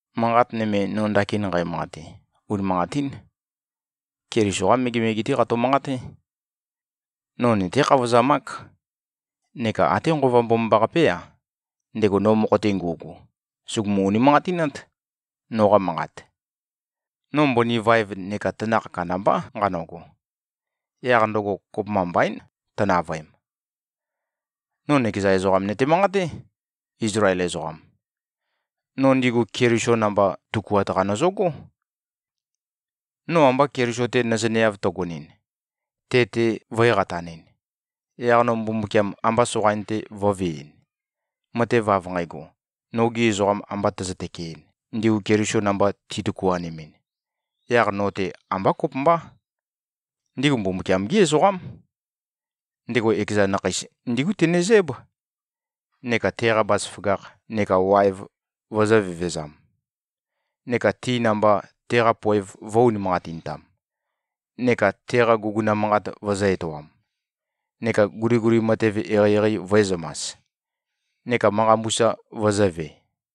Manqat nøme, no ndakin nqæmanqate, unimanqatín. Keliso-qá megemege-té qato-manqaté. No nøté-khavozamák. Neka até Nqova Mbomambaqapé-a, ndego no mokho-te ngu꞉gu, sùgumu-unimanqatinát, noqa manqat. No mbøni vaev neka tanakh kandambá nqanøgo. Yaq ndøgo kopømba mbaín, tønavøem. No nøkeza ezoqam nøte-manqaté, Izlael ezoqam. No ndigu Keliso namba tøkuat-qa nøzøgó. No amba Keliso-te nøzøneav tøgonɨn, te-te vø̄e-qatanɨn, yaq no Mbumbukiam amba soqain-te vø̄veɨn, matev av nqægo, nogi ezoqam amba tøzø-tøkeɨn, ndigu Keliso namba titøkuanemɨn, yaq no-te ambá kopømbá. Ndigu Mbumbukiam-gí ezoqám. Ndego ekeza nakheis ndígu tenezǽb, neka teqa bazaføgakh neka waev vøzø̄-vevezam, neka ti namba, teqa poev vø̄-unimanqatintam, neka teqa guguna manqat vøzø̄-etoam, neka guliguli matev eqeieqei vø̄ezømas, neka manqa mbusa vøzø̄ve.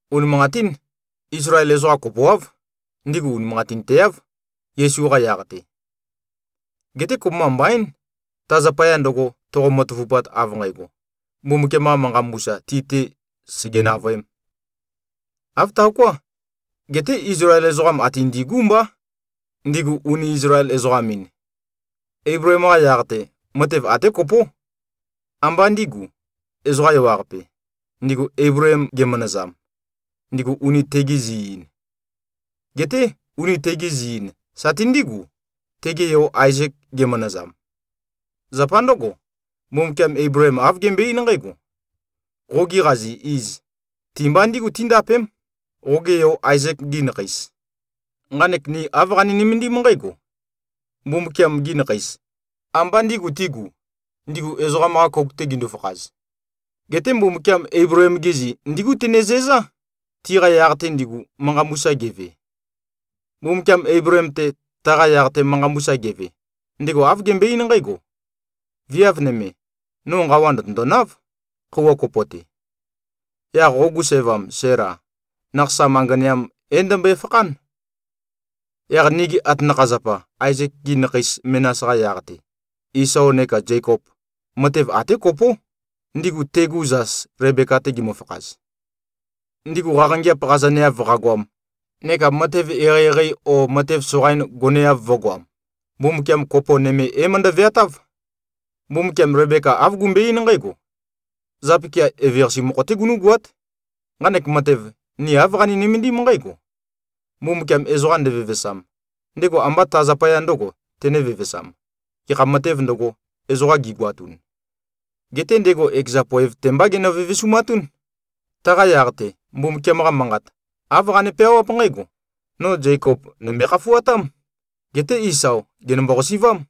Unimanqatín, Izlael ezoqa kopoáv, ndigu unimanqatinteáv, Yesu-qa yaq-te. Geté kopømba mbaín, ta zapaya ndøgo, toqo-matavupat av nqægo, Mbumbukiam-qa manqa mbusa ti-te, sège-navøēm. Āv taoká. Geté Izlael ezoqam ate ndigú mbá, ndigu uni Izlael-ezoqam-in. Eibleem-qa yaq-te, matev até kopó: Ambá ndīgu, ezoqa ewaqape, ndigu Eibleem gemanazam, ndigu uni tegi zi-īn. Geté uni tegi zi-in sati ndígu, tege yo Aezek gemanazam. Zapa ndǿgo, Mbumbukiam Eibleem āv gembøe-eín nqǽgo, “Qogi qazi iz, ti-mba ndígu tíndapém, qoge yo Aezek-gi nakheis.” Nqanek ni āv qani-nømendím nqǽgo: Mbumbukiam-gi nakheis, ambá ndīgu tigū, ndigu ezoqam-qa kouk-te gindu-fakhaz. Geté Mbumbukiam Eibleem-gi zi ndígu tenezæzá, tiqa yaq-te ndigu, manqa mbusa geve. Mbumbukiam Eibleem-te, taqa yaq-te manqa mbusa geve, ndego āv gembøe-eín nqǽgo, “Viav nøme, no nqawa ndø̀tøndonáv, khøuwa kopo-te. Yaq qogu sævam, Sæla, nakhasam anganeam é-ndømbøe-fakhán.” Yaq nigi atanakha-zapa Aezek-gi nakhei menas-qa yaq-te, Isao neka Zekop, matev até kopó, ndigu tegu zas Lebeka-te gimøfakhaz. Ndigu qaqangeap qazaneav qagoam neka matev eqeieqei o matev soqain goneav vø̄goam, Mbumbukiam kopo nøme é-møndø-veatáv. Mbumbukiam Lebeka āv gembøe-eín nqǽgo, “Zapikia eveqase mokho-té gunú꞉goát.” Nqanek matev, ni āv qani-nømendím nqǽgo: Mbumbukiam ezoqa ndevevesam, ndego ambá ta zapaya ndø̄go tene-vevesām, gekha matēv ndøgo, ezoqa gegoatun, geté ndego ekeza poev-te mbá genø-vevesumatún. Taqa yaq-te, Mbumbukiam-qa Manqat, āv qane-peawáp nqǽgo, “No Zekop, nø̀mbøe-khafuatám. Geté Isao, gènømbo-qasi꞉vám.”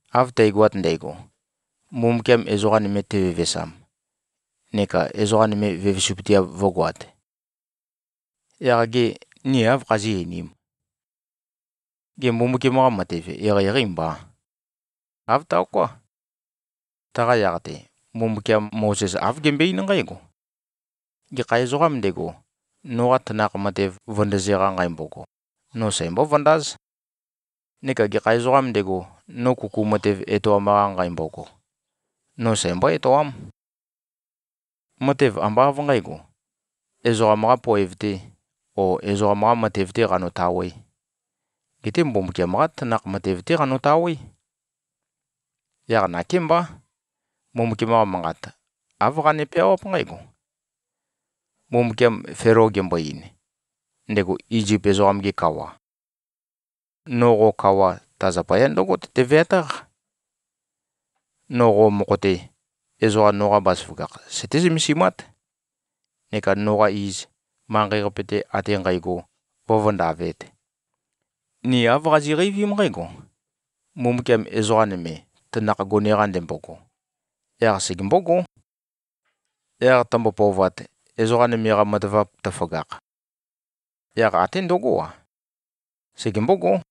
Av tægoat ndægo, Mbumbukiam ezoqa nøme tevevesam neka ezoqa nøme vevesupøteav vǿgoāt, yaq gê, ni áv khazí꞉-einīm? Gê, Mbumbukiam-qa matev eqeieqeî mbà? Āv taoká. Taqa yaq-te, Mbumbukiam Mozes āv gembøe-eín nqǽgo, “Gekha ezoqām ndego, noqa tanakh matev vøndøze-qa nqæmbogo, no sæmbó-vøndáz. Neka gekha ezoqām ndego, no kuku matev etoam-qa nqæmbogo, no sæmbó-etoám.” Matev ambá av nqǣgo, ezoqam-qā poev-tē o ezoqam-qā matev-tē qanotawē. Geté Mbumbukiam-qá tanakh matev-té qanotawé. Yaq nakémbá, Mbumbukiam-qa Manqat, āv qane-peawáp nqǽgo: Mbumbukiam Felo gembo-ein, ndego Izip ezoqam-ge kawa, “No qo kawa, ta zapaya ndǿgo tøte-veatáq: No qo mokho-te, ezoqa noqa bazaføgakh søté-zømesimát, neka noqa iz manqei-qape-te ate nqægo vǿvøndavēt.” Ni āv qazi꞉qeivím nqǽgo: Mbumbukiam ezoqa nøme, tanakh gone-qa ndembogo, yaq segembógó. Yaq tømbo-pøovat, ezoqa nøme-qa matavap tøføgakh, yaq até ndøgó-a, segembógó.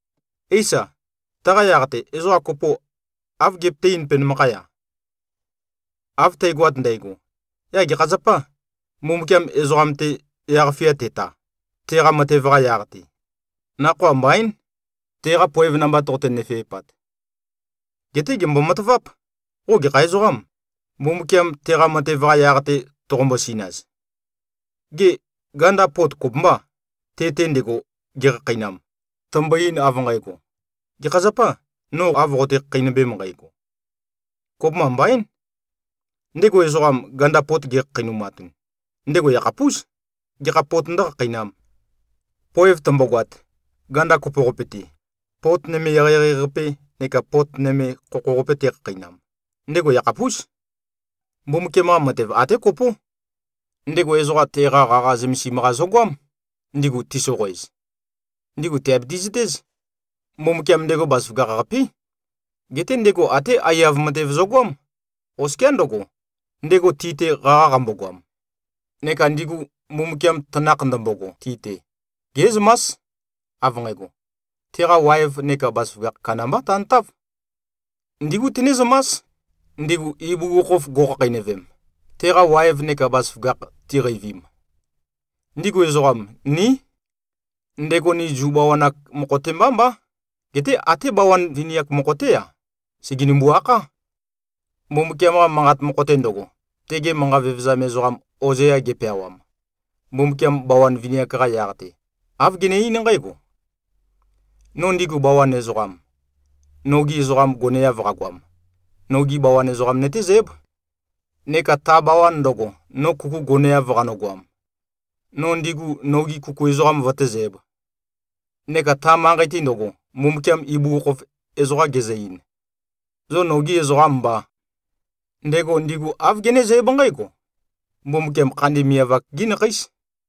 Éisa, taqa yaq-te ezoqa kopo, áv gepøté-eīn penømakhaya, “Av tægoat ndægo, yaq gekha zapâ, Mbumbukiam ezoqam-te yaq-fia teta, teqa matev-qa yaq-te? Nakhoa mbaín, teqa poev namba toqote-nøfeipat.” Geté, gèmbo-mataváp. Qo gekha ezoqâm, Mbumbukiam teqa matev-qa yaq-te toqombo-sinaz. Gê, ganda pot kopømbâ, te-te ndego gekhakheinam, tømbo-ein, av nqægo, “Gekha zapâ, no av qoqote-khakheinømbem nqægo?” Kopømba mbaín! Ndego ezoqam, ganda pot gekhakheinumatun, ndego yakhapús, gekha pot ndǿkhakheinām. Poev tømbogoat, ganda kopo-qapi-te, pot nøme eqeieqei-qape neka pot nøme khokho-qape tekhakheinam, ndego yakhapús. Mbumbukiam-qa matev até kopó. Ndego ezoqa teqa qaqa zømesim-qa zøgoám, ndigu tisoqoez. Ndigu tìabiti-zøtéz: Mbumbukiam ndego bazaføgakh-qapé. Geté ndego até aiyav matev zøgoám, oskiá ndøgo, ndego ti-te qaqa qambogoam. Neka ndigu, Mbumbukiam tanakh ndømbogo ti-te, gé꞉zømás, av nqægo, teqa waev neka bazaføgakh kandambá tantáv. Ndígu tenézømás, ndigu ibugukhokhof go꞉khakheinøvem, teqa waev neka bazaføgakh tiqeivim. Ndigu ezoqam, ní. Ndego ni Zu bawan-ak mokho-te mbá mbá, geté até bawan vini-ak mokho-té-a, sègenimbu-akhá. Mbumbukiam-qa Manqat mokho-te ndøgo, tege manqa vevezam ezoqam Ozea gepeawam, Mbumbukiam bawan vini-ak-qa yaq-te, āv gene-eín nqǽgo, “No ndigu bawan ezoqam, nogi ezoqam goneav qagoam, nogi bawan ezoqam nøtézǽb. Neka ta bawan ndøgo, no kuku goneav qanøgoam, no ndigu nogi kuku ezoqam vøtézǣb. Neka ta manqei-te ndøgo, Mbumbukiam ibugukhokhof ezoqa gezø-ein, ‘Zo nogī ezoqām mbā,’ ndego ndigu āv genézǽb nqǽgo: Mbumbukiam khandi miavak-gí nakheís.”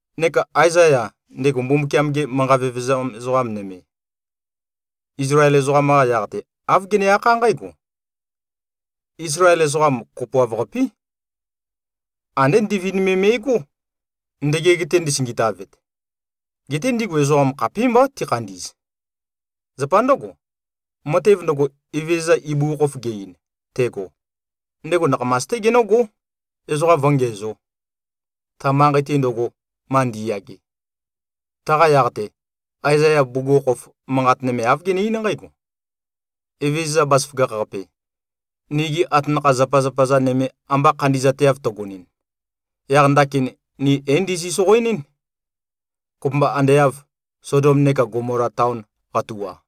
Neka Aezaya, ndego Mbumbukiam-ge manqa vevezam ezoqa nøme, Izlael ezoqam-qa yaq-te, āv gene-akhá nqǽgo, “Izlael ezoqam kopoav-qapí. Andé ndivind me me꞉gó, ndøgeg-te ndisingitavet. Geté ndigu ezoqa khapímbá tikhandi꞉z. Zapa ndǿgo, matev ndøgo, Evezøza ibugukhokhof ge-ein, tego, ndego nakhamas-té genǿgó, ezoqa vǿngiǣzo, ta manqei-te ndøgo, ma ndi꞉yage.” Taqa yaq-te, Aezaya bugukhokhof manqat nøme āv gene-eín nqǽgo, “Evezøza Bazaføgakh-qape, nigi atanakha-zapazapa-za nøme amba khandi꞉zateav tøgonɨn, yaq ndakin ni é-ndizi-soqoenɨ́n, kopømba ande av Sodom neka Gomola taon qatua.”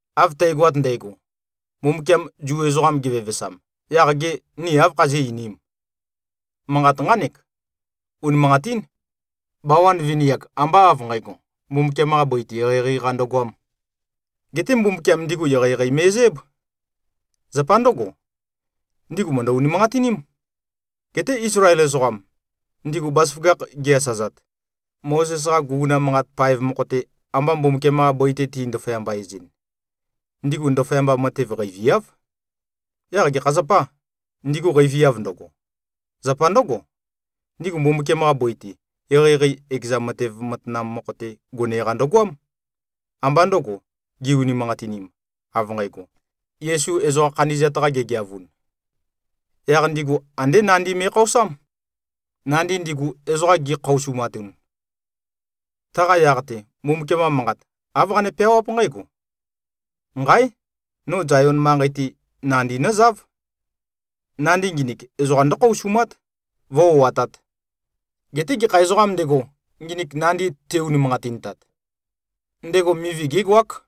Av tægoat ndægo, Mbumbukiam Zu ezoqam gevevesam, yaq gê, ni áv khazí꞉-einīm? Manqat nqánek: Unimanqatín. Bawan vini-ak ambá av nqǣgo, Mbumbukiam-qa bøi-te eqeieqei-qa ndøgoām. Geté Mbumbukiam ndigu eqeieqei me꞉zǽb. Zapa ndǿgo, ndigu mø̀ndø-unimanqatiním. Geté Izlael ezoqam, ndigu bazaføgakh gi-asazat, Mozes-qa guguna manqat paev mokho-te, amba Mbumbukiam-qa bøi-te ti-ndaføyamba-ez-ɨn, ndigu ndaføyamba matev qeiviáv. Yaq gekha zapâ, ndigu qeiviav ndøgo? Zapa ndǿgo, ndigu Mbumbukiam-qa bøi-te, eqeieqei ekeza matev matanam mokho-te gone-qa ndøgoám, ambá ndø̄go, gi-unimanqatinim, av nqægo, Yesu ezoqa khandi꞉zat-qa gigeavun. Yaq ndigu andé nandi me꞉khaosám, nandi ndigu, ezoqa gi꞉khaosumatun. Taqa yaq-te, Mbumbukiam-qa manqat, āv qane-peawáp nqǽgo, “Nqáe! No Zayon manqei-te, nandi nózáv. Nandi nginik, ezoqa ndǿkhaosumát, vǿ-o꞉atāt. Geté gekha ezoqām ndego, nginik nandi te-unimanqatintat, ndego mivi gégoák.”